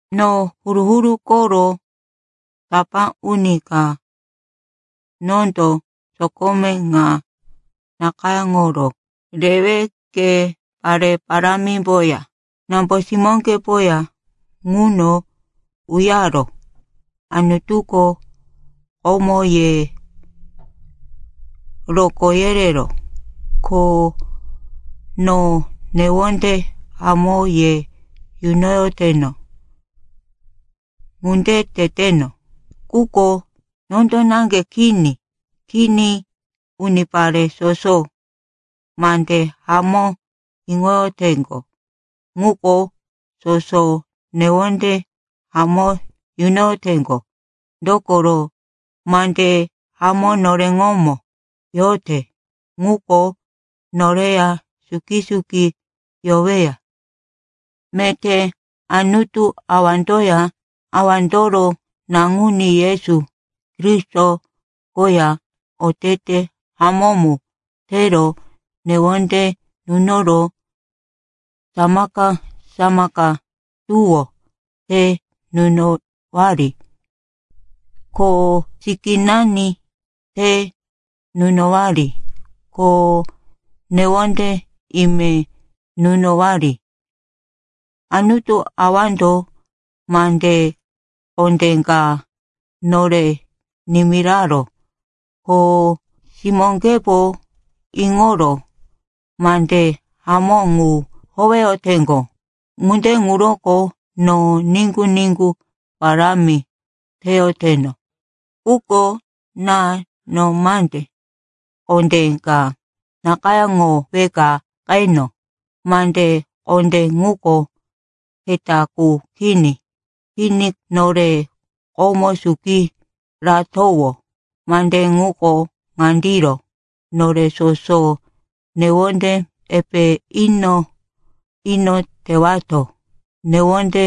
No huru-huru koro tapá uni ka, nondo sokome ŋa nakayáŋoro rewe ke pare parámimboya nambo-simóŋgepoya ŋuno uyaró. Anutuko komo ye rokó yereró, ko no newonde hamó ye yunoyoteno. Ŋunde teteno, quko nondo naŋge kini. Kini, unipare soso mande hamó iŋoyoteŋgo ŋuko soso newonde hamó yunoyoteŋgo. Dokoro mande hamó noreŋomo yote ŋuko noreya suki-suki yoweya. Meté Anutu Awandoya, Awandoro Naŋuní Yesu Kristo koya otete hamó mu tero newonde nunoro samaka-samaka tuwó te nunowari, ko sikínani te nunowari, ko newonde ime nunowari. Anutu Awando mande kondé ka nore nimiraró, ko simóŋgepo iŋoro mande hamó ŋu howeyoteŋgo. Ŋunde ŋuroko no niŋgu-niŋgu parámi teyoteno. Quko ná, no mande kondé ka nakayáŋoweka qeno. Mande kondé ŋuko keta qu kini. Kini, nore komo suki ratowó. Mande ŋuko ŋandiro: nore soso newonde epe ino-ino tewato. Newonde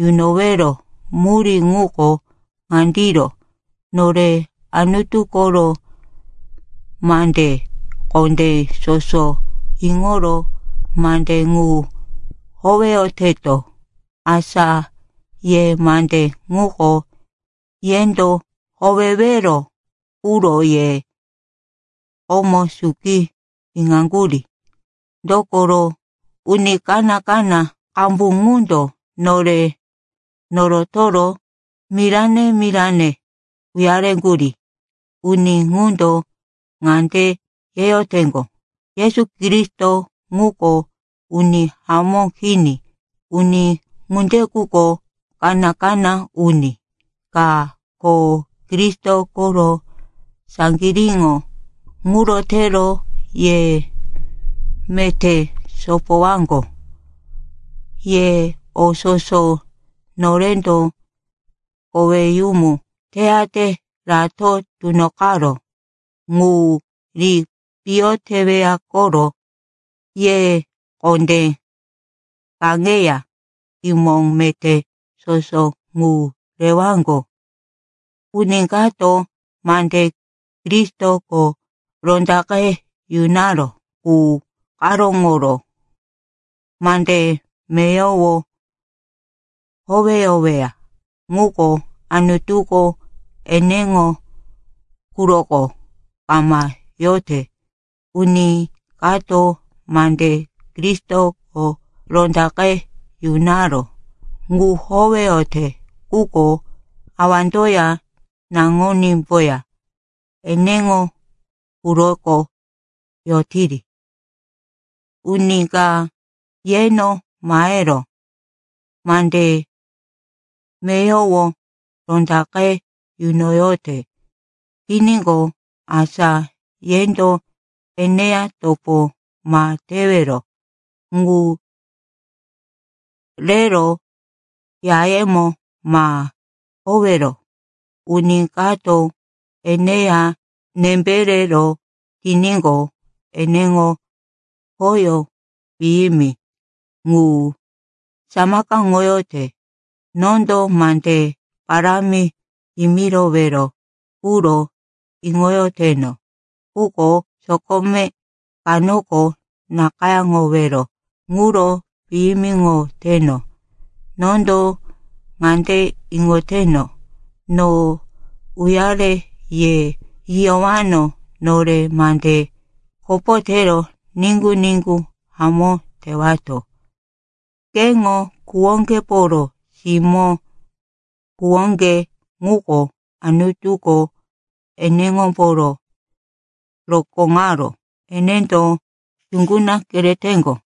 yunowero murí ŋuko ŋandiro: nore Anutu koro mande kondé soso iŋoro mande ŋu howeyoteto. Asa ye mande ŋuko yendo howewero quro ye komo suki iŋaŋgurí. Dokoro uni kaná-kaná qambu ŋundo nore norotoro mirane-mirane uyareŋgurí. Uni ŋundo ŋande yeyoteŋgo, Yesu Kristo ŋuko uni hamó kini. Uni ŋunde quko kaná-kaná uni ka, ko Kristo koro saŋgiríŋo. Ŋuro tero ye meté sopowaŋgo, ye o soso norendo koweyumu teyate rato tunoqaró ŋu ri piyo teweya koro. Ye kondé kaŋeya kimo meté soso ŋu rewaŋgo. Uni kato mande Kristoko rondaqe yunaró qu karóŋoro mande meyowo howeyoweya quko, Anutuko eneŋo quroko kama yote. Uni kato mande Kristoko rondaqe yunaró ŋu howeyote quko awandoya naŋunímboya eneŋo quroko yotiri. Uni ka yeno mahero mande meyowo rondaqe yunoyote tiníqo, asa yendo eneya topo ma tewero, ŋu rero yayemo ma owero. Uni kato eneya nembe rero tiníqo, eneŋo khoyó piyimi ŋu samakaŋoyote. Nondo mande parámi yimirowero quro iŋoyoteno, quko sokome kanoko nakayáŋowero ŋuro piyimiŋoteno. Nondo ŋande iŋoteno, no uyare ye yiyowano, nore mande kopo tero niŋgu-niŋgu hamó tewato. Keŋo kuwoŋgeporo simó, kuwoŋge ŋuko Anutuko eneŋomboro rokóŋaró, enendo yuŋguna kereteŋgo.